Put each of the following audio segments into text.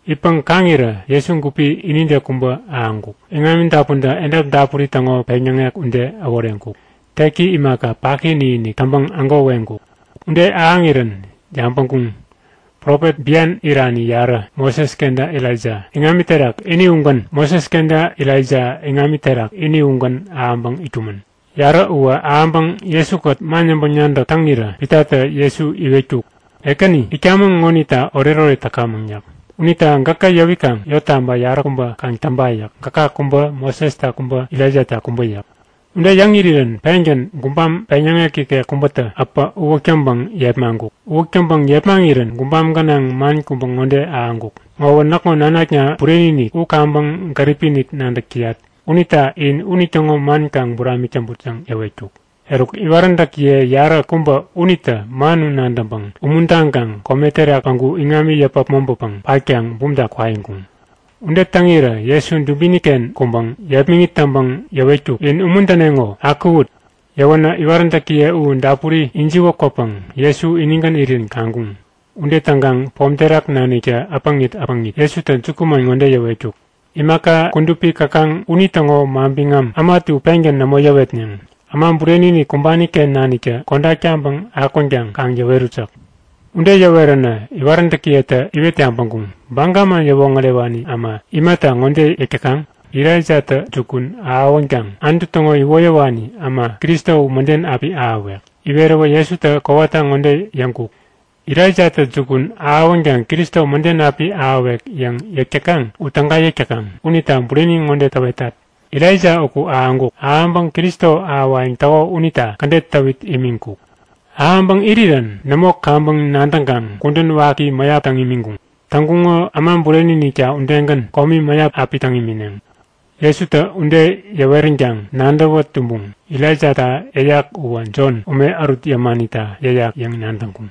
Itpäŋ kaŋirä Jesu gupi inide kubä ahäŋkuk. Iŋami dapuntä edap dapuri täŋo peŋyäŋek ude äworeŋkuk. Teki imaka paki inikinik täŋpäŋ ägo weŋkuk. Ude ahäŋirän yabäŋkuŋ; Profet bian irani yarä, Moses kenta Elaija iŋami terak ini ugän ahäŋpäŋ itkumän. Yarä uwä ahäŋpäŋ Jesu-kät man yäŋpäŋ-nadäk täŋirä Pitatä Jesu iwetkuk; Ekäni, itkamäŋ ŋonita oretoret täkamäŋ yäk. Unita gäkä yäwikaŋ yottaba yaräkubä kaŋ täŋpa yäk. Gäka kubä, Mosesta kubä, Elaijata kubä yäk. Ude yäŋ irirän pengän gubam peŋyäŋek ikek kubätä äpä uwäk täŋpäŋ yepmaŋkuk. Uwäk täŋpäŋ yepmaŋirän gubam gänaŋ man kubä ŋode ahäŋkuk; Ŋowä näkŋo nanakna bureni-inik. U kaŋpäŋ gäripi-inik nadäk täyat unita in unitäŋo man kaŋ buramik täŋput yäŋ yäwetkuk. Eruk iwaräntäkiye yaräkubä unitä man u nadäŋpäŋ umuntaŋkaŋ kome terak päŋku iŋami yäpä äpmoŋpäpäŋ patkaŋ bumta kwaiŋkuŋ. Ude täŋirä Jesu dubini-ken kuŋpäŋ yepmäŋit täŋpäŋ yäwetkuk; In umuntäneŋo! Akuwut! Yäwänä iwaräntäkiye u dapuri ijiwä kwäpäŋ Jesu inigän irirän kaŋkuŋ. Ude täŋkaŋ pom terak naniktä äpäŋit äpäŋit Jesutä jukuman ŋode yäwetkuk; Imaka kudupi käkaŋ unitäŋo manbiŋam äma ätu pengän nämo yäwetneŋ. Äma Bureni-inik kumbani-ken naniktä kodak taŋpäŋ akwänkaŋ kaŋ yäwerut yäk. Ude yäweränä iwaräntäkiyetä iwet yabäŋkuŋ; Baga man yäwoŋärewani äma imata ŋode yäk täkaŋ? Elaijatä jukun ahäwänkaŋ Anutu täŋo iwoyäwani äma Kristo u mäden api ahäwek. Iweräwä Jesutä kowata ŋode yäŋkuk; Elaijatä jukun ahäwänkaŋ Kristo mäden api ahäwek yäŋ yäk täkaŋ u täga yäk täkaŋ. Unita bureni ŋode täwetat; Elaija uku ahäŋkuk. Ahäŋpäŋ Kristo ahäwayäŋ täko unita kädet täwit imiŋkuk. Ahäŋpäŋ irirän nämo kaŋpäŋ nadäŋkaŋ kudän waki mäyap täŋ imiŋkuŋ. Täŋkuŋo Äma Bureni-inikta udegän komi mäyap api täŋ imineŋ. Jesutä ude yäweränkaŋ nadäwä tumbuŋ; Elaijata yäyak uwä Jon ume ärut yämanita yäyak yäŋ nadäŋkuŋ.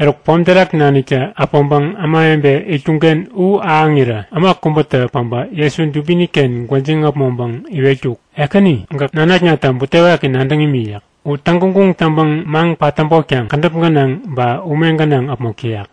Eruk pom terak naniktä äpäŋpäŋ ämawebe itkuŋ-ken u ahäŋirä äma kubätä päbä Jesu dubini-ken gwäjiŋ äpmoŋpäŋ iwetkuk; Ekäni, gäk nanaknata butewaki nadäŋ imi yäk. U täŋguŋguŋ taŋpäŋ maŋ-patäbotkaŋ kädäp gänaŋ ba ume gänaŋ äpmok täyak.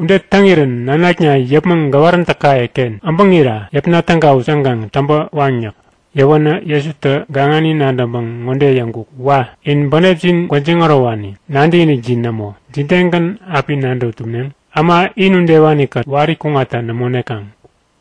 Ude täŋirän nanakna yäpmäŋ gäwaräntäkaye-ken äbäŋira yäpna tägawut yäŋkaŋ täŋpä waŋ yäk. Yäwänä Jesutä gaŋani nadäŋpäŋ ŋode yäŋkuk; Wa! In bänepjin gwäjiŋ ärowani. Nadäkinikjin nämo! Jidegän api nadäwä tumneŋ? Äma in udewani-kät wari kuŋatta nämo nekaŋ!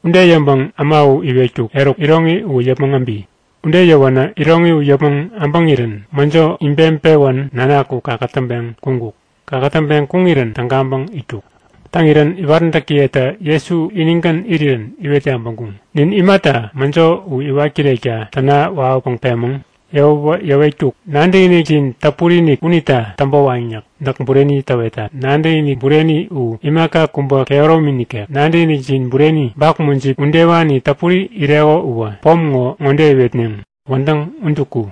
Ude yäŋpäŋ äma u iwetkuk; Eruk, iroŋi uwä yäpmäŋ äbi! Ude yäwänä iroŋi u yäpmäŋ äbäŋirän mäjo ibeŋpewän nanak u kakätäŋpeŋ kuŋkuk. Kakätäŋpeŋ kuŋirän tägaŋpäŋ itkuk. Täŋirän iwaräntäkiyetä Jesu inigän irirän iwet yabäŋkuŋ; Nin imata mäjo u iwat kirekta täna wawäpäŋ pemäŋ? Yäwäwä yäwetkuk; Nadäkinikjin täpuri-inik unita täŋpä waŋ yäk. Näk bureni täwetat; Nadäkinik bureni u imaka kubä kehäromi nikek. Nadäkinikjin bureni, bak mujip udewani täpuri ireko uwä pom ŋo ŋode iwetneŋ; Wädäŋ udu ku!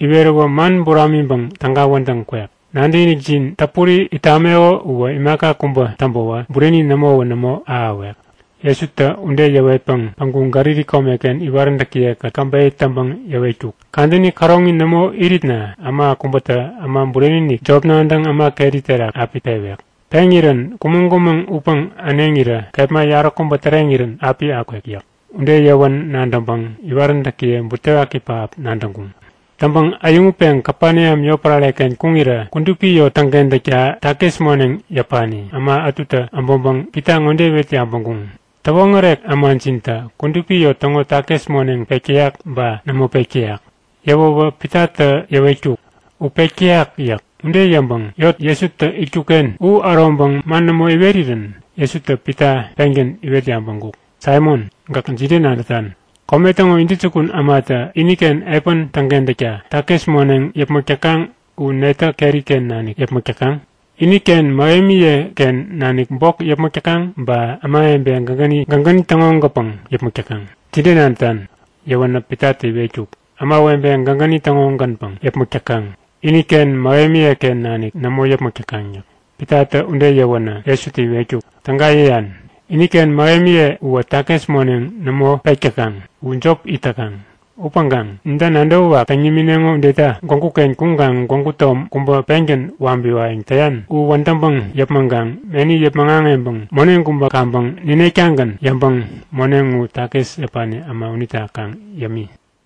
Iweräwä man buramiŋpäŋ täga wädäŋ kwek. Nadäkinikjin täpuri it tameko uwä imaka kubä täŋpäwä bureni nämowä nämo ahäwek. Jesutä ude yäwetpäŋ päŋku Galili komeken iwaräntäkiye-kät käbeyä täŋpäŋ yäwetkuk; Kadäni käroŋi nämo iritna äma kubätä Äma Bureni-inik jop nadäŋ äma keri terak api pewek. Peŋirän kumäŋ-kumäŋ utpäŋ äneŋirä kepma yaräkubä täreŋirän api akwek yäk. Ude yäwän nadäŋpäŋ iwaräntäkiye butewaki pähap nadäŋkuŋ. Täŋpäŋ äyäŋutpeŋ Kapeneam yotpärare-ken kuŋirä kudupi yot täŋkentäkta takis moneŋ yäpani äma ätutä äbäŋpäŋ Pita ŋode iwet yabäŋkuŋ; Täwoŋärek ämajintä kudupi yot täŋo takis moneŋ pek täyak ba nämo pek täyak? Yäwäwä Pitatä yäwetkuk; U pek täyak! yäk. Ude yäŋpäŋ yot Jesutä itkuk-ken u äroŋpäŋ man nämo iwerirän Jesutä Pita pengän iwet yabäŋkuk; Saimon, gäk jide nadätan? Kome täŋo intäjukun ämatä iniken epän täŋkentäkta takis moneŋ yäpmäk täkaŋ u netä keri-ken nanik yäpmäk täkaŋ? Iniken mähemiye-ken nanik bok yäpmäk täkaŋ ba ämawebe gägäni täŋo-gänpäŋ yäpmäk täkaŋ? Jide nadätan? Yäwänä Pitatä iwetkuk; Ämawebe gägäni täŋo-gänpäŋ yäpmäk täkaŋ, iniken mähemiye-ken nanik nämo yäpmäk täkaŋ yäk. Pitatä ude yäwänä Jesutä iwetkuk; Täga yäyan, iniken mähemiye uwä takis moneŋ nämo pek täkaŋ. U jop it täkaŋ. Upäŋkaŋ ninta nadäwä wak täŋ nimineŋo udeta gwägu-ken kuŋkaŋ gwägu tom kubä pengän wabiwayäŋ täyan u wädäŋpäŋ yäpmäŋkaŋ meni yäpmäŋ aŋeŋpäŋ moneŋ kubä kaŋpäŋ ninek-tagän yäŋpäŋ moneŋ u takis yäpani äma unita kaŋ yämi.